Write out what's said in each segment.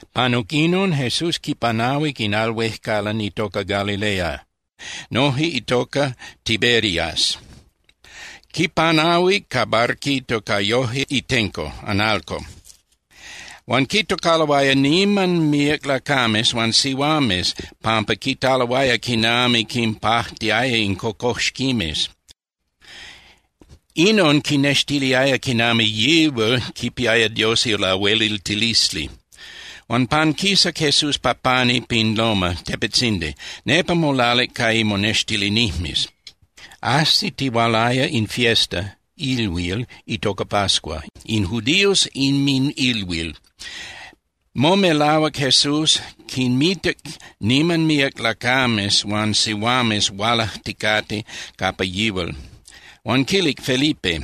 Panuc inon, Jesús quipanahuic in al huejcalan itoca Galilea, noje itoca Tiberias. Quipanahuic ca barquito ca yoje itenco (analco). Huan quitocaloaya niman míac lacames huan sihuames pampa quitaloaya quinami quinpajtiaya in cocoxquimes. Inon quinextiliaya quinami yihual quipiaya Dios ilahueliltilisli. Huan panquisac Jesús pa pani pin loma (tepetzindi), nepa molalic ca imonextilinijmes. Ajsitihualaya in fiesta (ilhuil) itoca pascua, in judíos inminilhuil. Momelahuac Jesús, quinmitac niman míac lacames huan sihuames hualajticate capa yihual, huan quilic Felipe: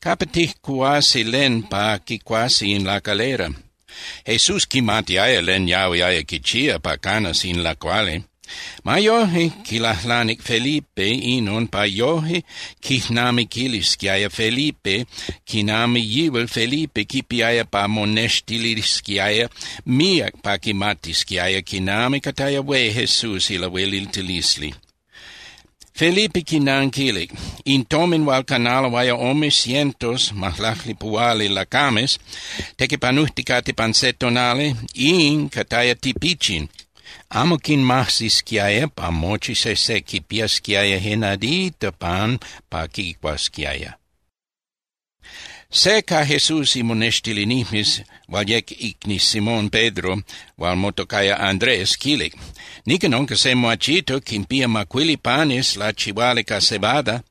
—¿Capa tijcuhuasi len pa quicuasi in lacalera? Jesús quimatiaya len yahuiaya quichía pa canas in lacuali. Ma yoje, quilajlanic Felipe inon pa yoje quijnamiquiltisquiaya Felipe quinami yihual Felipe quipiaya pa monextilisquiaya míac pa quimatisquiaya quinami cataya hué Jesús ilahueliltilisli. Felipe quinanquilic: —In tomin hual canaloaya ome cientos (majlaclipuhuali) lacames tequipanujticate pan se tonali, in cataya tipichin, amo quinmajsisquiaya pa mochi sejse quipiasquiaya je nadita pan pa quicuasquiaya. Se ca Jesús imonextilinijmes hual yec icni Simón Pedro, huan motocaya Andrés, quilic: —Nican unca se muachito, quinpía macuili panes lachihuali ca cebada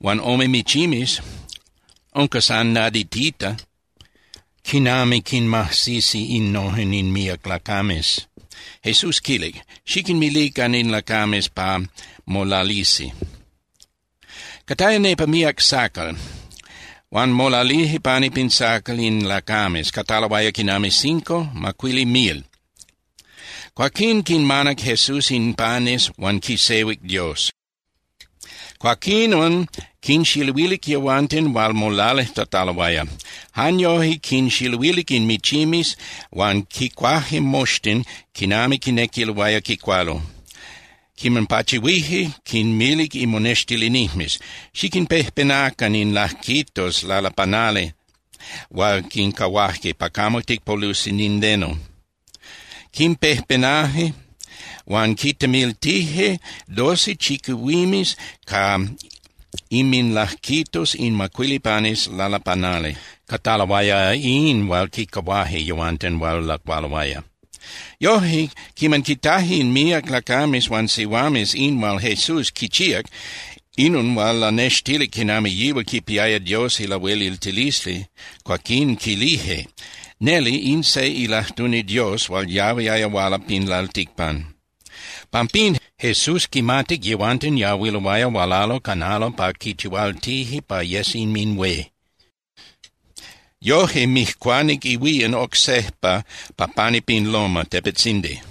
huan ome michimes. Unca san naditita. ¿Quinami quinmajsisi innojen in míac lacames? Jesús quilic: —Xiquinmilican in lacames pa molalisi. Cataya nepa míac sacal. Huan molalije pani pin sacal in lacames, cataloaya quinami cinco (macuili) mil. Cuaquín quinmanac Jesús in panes huan quisehuic Dios. Cuaquinon quinxiluilic yehuanten hual molalijtataloaya. Jan yoje quinxiluilic in michimes huan quicuaje moxtin quinami quinequiloaya quicualo. Quiman pachihuije, quinmilic imonextilinijmes: —Xiquinpejpenacan in lajquitos lalapanali hual quincahuaje, pa camo ticpolusi nindeno. Quimpejpenaje huan quintemiltije doce chiquihuimes ca inminlajquitos in macuili panes lalapanali. Cataloaya in hual quicahuaje yehuanten hual lacualoaya. Yoje, quiman quitaje in míac lacames huan sihuames in hual Jesús quichíac, inon hual lanextilic quinami yihual quipiaya Dios ilahueliltilisli, cuaquín quilije: —Neli in se ilajtuni Dios hual yahuiaya huala pin lalticpan. Pampín, Jesús quimatic yehuanten yahuiloaya hualalo canalo pa quichihualtije pa yes inminhué. Yoje mijcuanic ihuían oc sejpa pa pani pin loma (tepetzindi).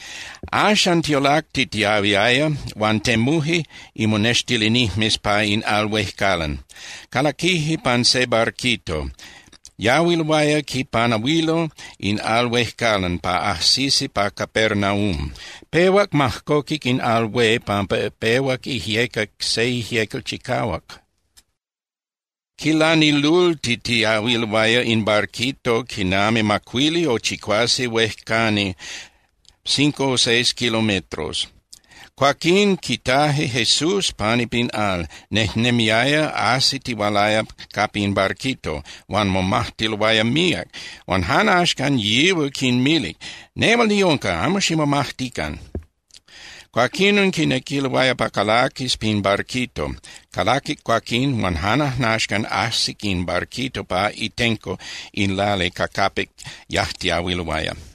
Axan tiolactitiahuiaya, huan temuje imonextilinijmes pa in al huejcalan. Calaquije pan se barquito, yahuiloaya quipanahuilo in al huejcalan pa ajsisi pa Capernaum. Pehuac majcoquic in al hué pampa pehuac ijyecac se ijyecal chicahuac. Quilanilultitiahuiloaya in barquito quinami macuili o chicuase huejcani (cinco o seis kilometros), cuaquín quitaje Jesús pani pin al, nejnemiaya ajsitihualaya capa in barquito, huan momajtiloaya míac. Huan jan axcan yihual quinmilic: —¡Nehual niunca, amo ximomajtican! Cuaquinon quinequiloaya pa calaquis pin barquito. Calaquic cuaquín, huan jan ajnaxcan ajsic in barquito pa itenco in lali ca capic yajtiahuiloaya.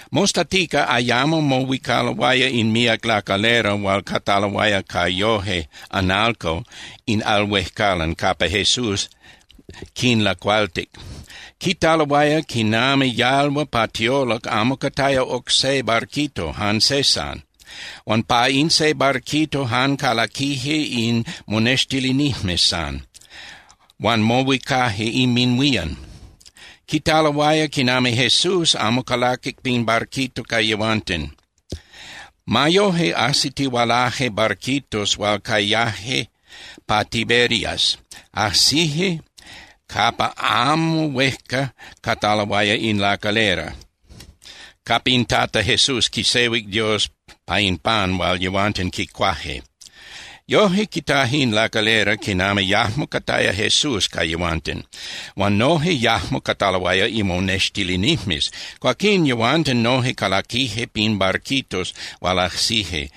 Mostatica ayamo mohuicaloaya in míac lacalera hual cataloaya ca yoje (analco) in al huejcalan, capa Jesús quinlacualtic. Quitaloaya quinami yalhua pa tiolac amo cataya oc se barquito, jan se san, huan pa in se barquito jan calaquije in monextilinijmes san, huan mohuicaje inminhuían. Quitaloaya quinami Jesús amo calaquic pin barquito ca yehuanten. Ma yoje ajsitihualaje barquitos hual cayaje pa Tiberias, ajsije capa amo huejca cataloaya in lacalera, capa in Tata Jesús quisehuic Dios pa in pan hual yehuanten quicuaje. Yoje, quitaje in lacalera quinami yajmo cataya Jesús ca yehuanten, huan noje yajmo cataloaya imonextilinijmes. Cuaquín yehuanten noje calaquije pin barquitos hual ajsije,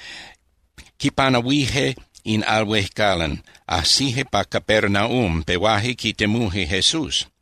quipanahuije in al huejcalan, ajsije pa Capernaum, pehuaje quitemuje Jesús.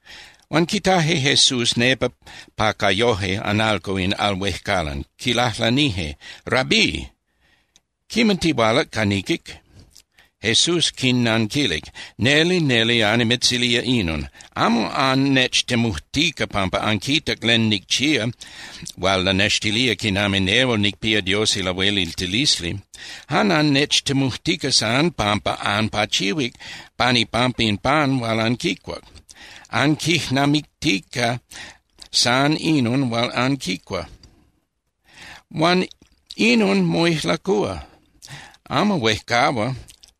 Huan quitaje Jesús nepa pa ca yoje (analco) in al huejcalan, quilajlanije: —Rabí, ¿quiman tihualac ca niquic? Jesús quinnanquilic: —Neli, neli annimitzilía inon: Amo annechtemujtica pampa anquitac len nicchía hual lanextilía quinami nehual nicpía Dios ilahueliltilisli. Jan annechtemujtica san pampa anpachihuic pan ipampa in pan hual anquicuac. Anquijnamictica san inon hual anquicua. Huan inon moijlacúa, amo huejcahua,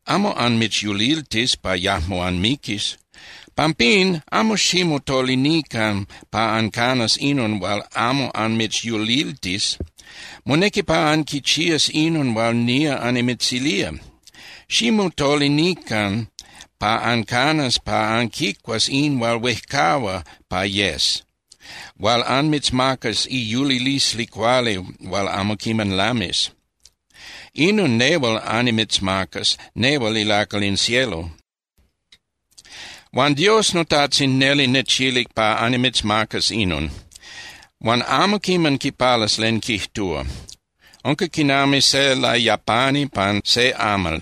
amo anmitzyuliltis pa yajmo anmiquis. Pampín, amo ximotolinican pa ancanas inon hual amo anmitzyuliltis. Monequi pa anquichías inon hual nía annimitzilía. Ximotolinican pa ancanas pa anquicuas in hual huejcahua pa yes, hual anmitzmacas iyulilisli cuali hual amo quiman lamis. Inon nehual annimitzmacas, nehual ilacal in cielo. Huan Dios noTajtzin neli nechilic pa annimitzmacas inon. Huan amo quiman quipalas len quijtúa. Unca quinami se layapani pan se amal,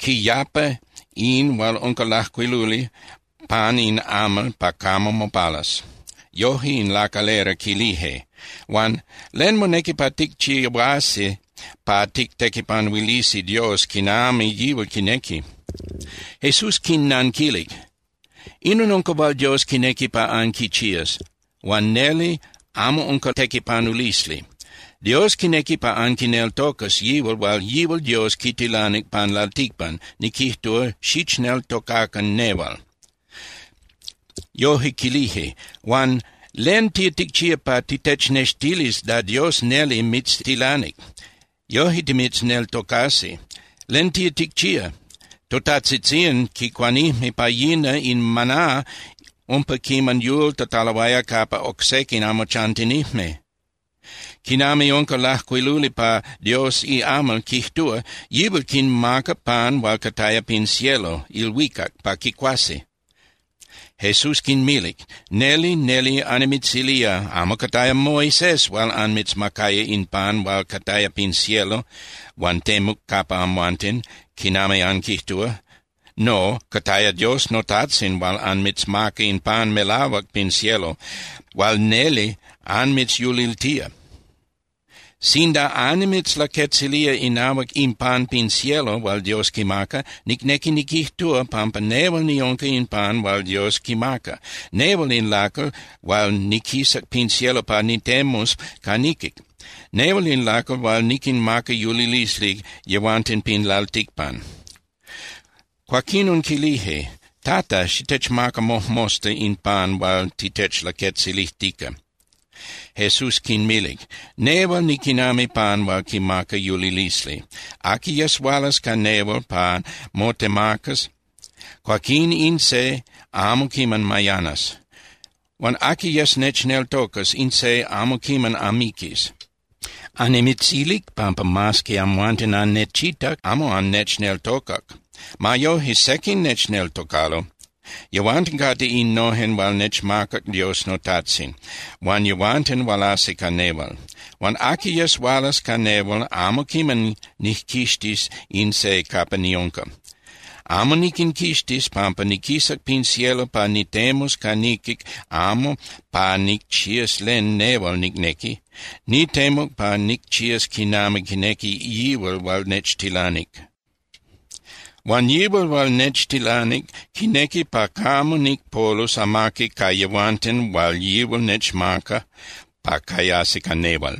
quiyapa in hual unca lajcuiluli pan in amal pa camo mopalas. Yoje in lacalera quilije: —Huan ¿len monequi pa ticchihuasi pa tictequipanuilisi Dios quinami yihual quinequi? Jesús quinnanquilic: —Inon unca hual Dios quinequi pa anquichías, huan neli, amo unca tequipanulisli. Dios quinequi pa anquineltocas yihual hual yihual Dios quitilanic pan lalticpan, niquijtúa, xichneltocacan nehual. Yoje quilije: —Huan ¿len tía ticchía pa titechnextilis da Dios neli mitztilanic? Yoje timitzneltocasi. ¿Len tía ticchía? Totajtzitzían quicuanijme pa yina in maná umpa quiman yultataloaya capa oc sequin amo chantinijme. Quinami unca lajcuiluli pa Dios iamal, quijtúa: “Yihual quinmacac pan hual cataya pin cielo (ilhuicac) pa quicuasi.” Jesús quinmilic: —Neli, neli annimitzilía, amo cataya Moisés hual anmitzmacaya in pan hual cataya pin cielo huan temuc capa amhuanten, quinami anquijtúa. No, cataya Dios noTajtzin hual anmitzmaca in pan melahuac pin cielo hual neli anmitzyuliltía. Sinda annimitzlaquetzilía inahuac in pan pin cielo hual Dios quimaca, nicnequi niquijtúa pampa nehual niunca in pan hual Dios quimaca, nehual in lacal hual niquisac pin cielo pa nitemus ca niquic. Nehual in lacal hual niquinmaca yulilisli yehuanten pin lalticpan. Cuaquinon quilije: —Tata, xitechmaca mojmosta in pan hual titechlaquetzilijtica. Jesús quinmilic: —Nehual niquinami pan hual quimaca yulilisli. Aqui yes hualas ca nehual pa motemacas, cuaquín in se amo quiman mayanas. Huan aqui yes nechneltocas, in se amo quiman amiquis. Annimitzilic pampa mas que amhuanten annechitac, amo annechneltocac. Ma yoje, sequin nechneltocalo. Yehuanten cate innojen hual nechmacac Dios noTajtzin, huan yehuanten hualasi ca nehual. Huan aqui yes hualas ca nehual, amo quiman nijquixtis in se capa niunca. Amo niquinquixtis, pampa niquisac pin cielo pa nitemus ca niquic amo pa nicchías len nehual nicnequi. Nitemuc pa nicchías quinami quinequi yihual hual nechtilanic. Huan yihual hual nechtilanic quinequi pa camo nicpolus amaqui ca yehuanten hual yihual nechmaca pa cayasi ca nehual.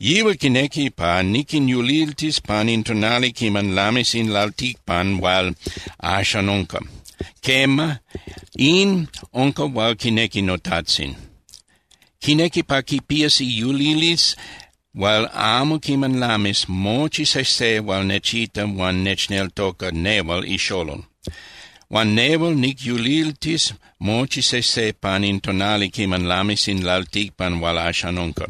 Yihual quinequi pa niquinyuliltis pan in tonali quiman lamis in lalticpan hual axan unca. Quema, in unca hual quinequi noTajtzin. Quinequi pa quipías iyulilisli hual amo quiman lamis mochi sejse hual nechita huan nechneltoca nehual iXolol. Huan nehual nicyuliltis mochi sejse pan in tonali quiman lamis in lalticpan hual axan unca.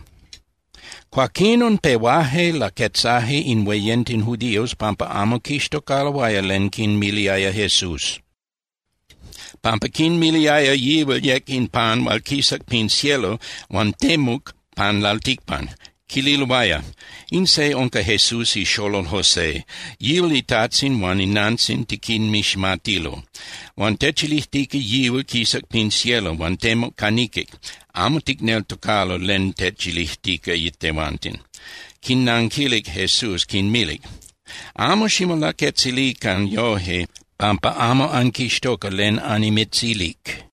Cuaquinon pehuaje laquetzaje in hueyenten judíos pampa amo quixtocaloaya len quinmiliaya Jesús, pampa quinmiliaya yihual yec in pan hual quisac pin cielo huan temuc pan lalticpan. Quililoaya: —In se unca Jesús ixolol José, yihual itajtzin huan inantzin tiquinmiximatilo. Huan techilijtica yihual quisac pin cielo huan temuc ca niquic. Amo ticneltocalo len techilijtica tehuanten. Quinnanquilic Jesús, quinmilic: —Amo ximolaquetzilican yoje pampa amo anquixtoca len annimitzilic.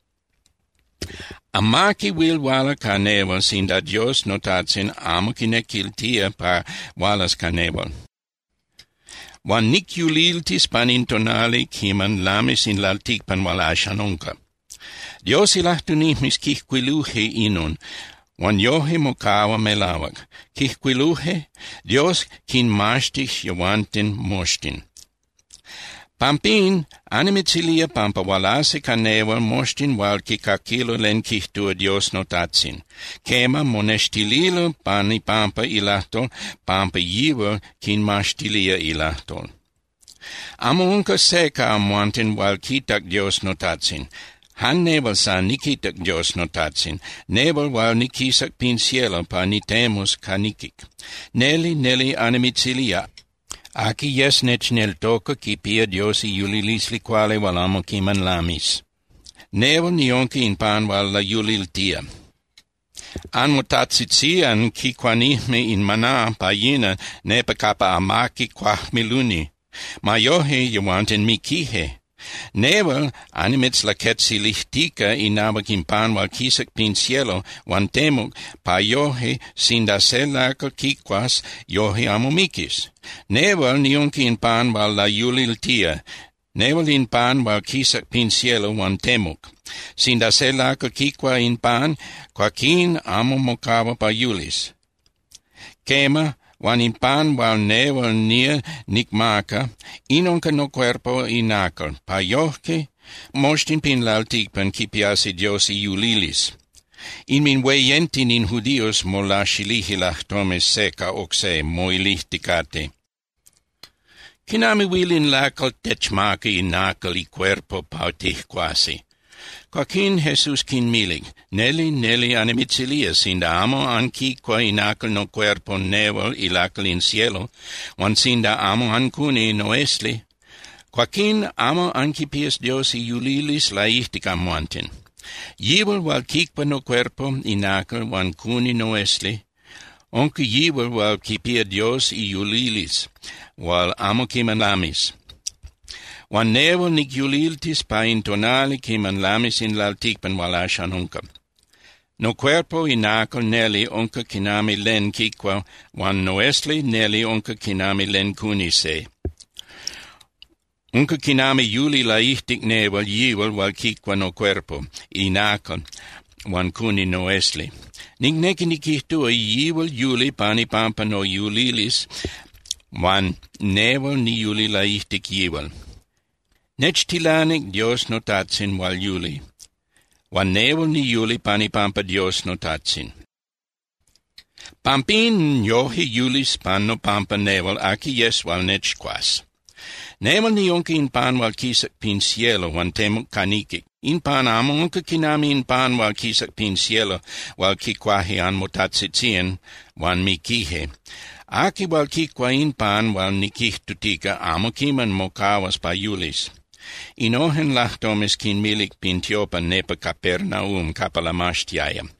Amaqui huil huala ca nehual sinda Dios noTajtzin amo quinequiltía pa hualas ca nehual. Huan nicyuliltis pan in tonali quiman lamis in lalticpan hual axan unca. Dios ilajtunijmes quijcuiluje inon, huan yoje mocahua melahuac. Quijcuiluje: “Dios quinmaxtis yehuanten moxtin.” Pampín annimitzilía pampa hualasi ca nehual moxtin hual quicaquilo len quijtúa Dios noTajtzin. Quema, monextililo pan ipampa ilajtol pampa yihual quinmaxtilía ilajtol. ’Amo unca se ca amhuanten hual quitac Dios noTajtzin. Jan nehual san niquitac Dios noTajtzin, nehual hual niquisac pin cielo pa nitemus ca niquic. Neli, neli annimitzilía, aqui yes nechneltoca quipía Dios iyulilisli cuali hual amo quiman lamis. Nehual niunca in pan hual layuliltía. Anmotajtzitzían quicuanijme in maná pa yina nepa capa amaqui cuajmiluni. Ma yoje, yehuanten miquije. Nehual annimitzlaquetzilijtica inahuac in pan hual quisac pin cielo huan temuc, pa yoje, sinda se lacal quicuas, yoje amo miquis. Nehual niunca in pan hual layuliltía, nehual in pan hual quisac pin cielo huan temuc. Sinda se lacal quicua in pan, cuaquín amo mocahua pa yulis. Quema, huan in pan hual nehual nía nicmaca, in unca nocuerpo inacal, pa yoje moxtin pin lalticpan quipiasi Dios iyulilisli. Inminhueyenten in judíos molaxilije lajtomes se ca oc se, moilijticate: —¿Quinami huil in lacal techmaca inacal icuerpo pa tijcuasi? Cuaquín Jesús quinmilic: —Neli, neli annimitzilía, sinda amo anquicua inacal nocuerpo nehual ilacal in cielo, huan sinda amo ancuni noesli, cuaquín amo anquipías Dios iyulilisli laijtic amhuanten. Yihual hual quicua nocuerpo inacal huan cuni noesli, unca yihual hual quipía Dios iyulilisli hual amo quiman lamis. Huan nehual nicyuliltis pa in tonali quiman lamis in lalticpan hual axan unca. Nocuerpo inacal neli unca quinami len quicua huan noesli neli unca quinami len cuni se. Unca quinami yuli laijtic nehual yihual hual quicua nocuerpo inacal huan cuni noesli. Nicnequi niquijtúa yihual yuli pan ipampa noyulilisli huan nehual niyuli laijtic yihual. Nechtilanic Dios noTajtzin hual yuli, huan nehual niyuli pan ipampa Dios noTajtzin. Pampín yoje yulis pan nopampa nehual aqui yes hual nechcuas. Nehual niunca in pan hual quisac pin cielo huan temuc ca niquic. In pan amo unca quinami in pan hual quisac pin cielo hual quicuaje anmotajtzitzían huan miquije. Aqui hual quicua in pan hual niquijtutica amo quiman mocahuas pa yulis. Innojen lajtomes quinmilic pin tiopan nepa Capernaum capa lamaxtiaya.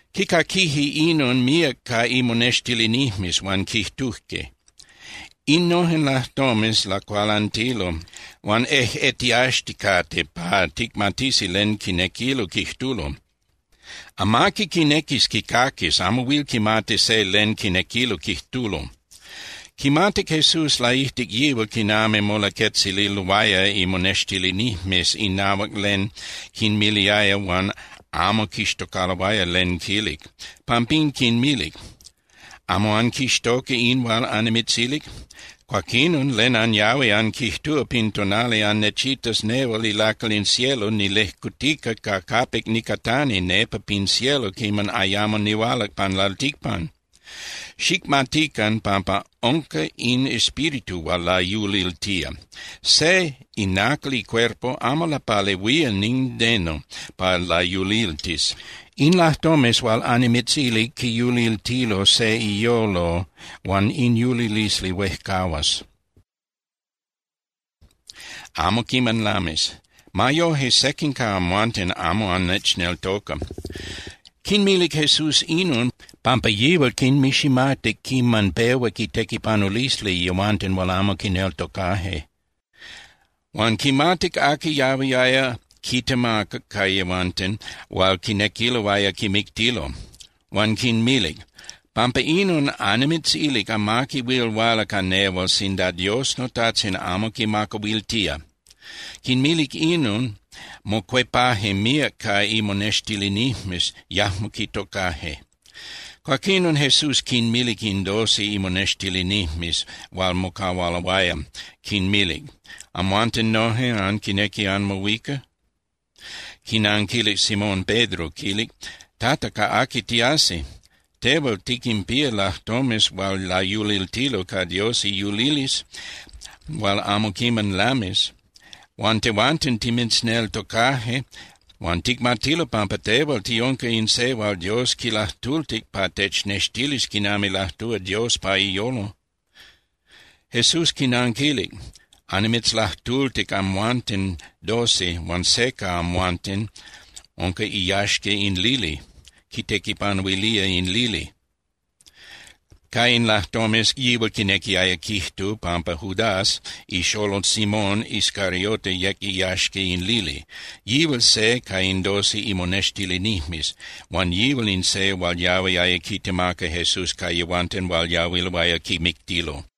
Quicaquije inon míac ca imonextilinijmes huan quijtuje: —Innojen lajtomes lacualantilo huan ejꞌetiaxticate pa ticmatisi len quinequilo quijtulo. Amaqui quinequis quicaquis, amo huil quimati se len quinequilo quijtulo. Quimatic Jesús laijtic yihual quinami molaquetzililoaya imonextilinijmes inahuac len quinmiliaya huan amo quixtocaloaya len quilic. Pampín quinmilic: —¿Amo anquixtoca in hual annimitzilic? Cuaquinon, ¿len anyahui anquijtúa pin tonali annechitas nehual ilacal in cielo nilejcutica ca capic nicatani nepa pin cielo quiman ayamo nihualac pan lalticpan? Xicmatican pampa unca in Espíritu hual layuliltía. Se inacal icuerpo amo lapalehuía nindeno pa layuliltis. In lajtomes hual annimitzilic quiyuliltilo se iyolo huan in yulilisli huejcahuas, amo quiman lamis. Ma yoje, sequin ca amhuanten amo annechneltoca. Quinmilic Jesús inon, pampa yihual quinmiximatic quiman pehuac itequipanulisli yehuanten hual amo quineltocaje. Huan quimatic aqui yahuiaya quitemaca ca yehuanten hual quinequiloaya quimictilo. Huan quinmilic: —Pampa inon annimitzilic amaqui huil huala ca nehual sinda Dios noTajtzin amo quimacahuiltía. Quinmilic inon, mocuepaje míac ca imonextilinijmes, yajmo quitocaje. Cuaquinon Jesús quinmilic in doce imonextilinijmes hual mocahualoaya, quinmilic: —¿Amhuanten noje anquinequi anmohuica? Quinanquilic Simón Pedro, quilic: —Tata, ¿ca aqui tiasi? Tehual tiquinpía lajtomes hual layuliltilo ca Dios iyulilisli hual amo quiman lamis. Huan tehuanten timitzneltocaje huan ticmatilo pampa tehual tiunca in se hual Dios quilajtultic pa technextilis quinami lajtúa Dios pa iyolo. Jesús quinanquilic: —Annimitzlajtultic amhuanten doce huan se ca amhuanten unca iyaxca in lili, quitequipanuilía in lili. Ca in lajtomes yihual quinequiaya quijtu pampa Judas ixolol Simón Iscariote yec iyaxca in lili. Yihual se ca in doce imonextilinijmes, huan yihual in se hual yahuiaya quitemaca Jesús ca yehuanten hual yahuiloaya quimictilo.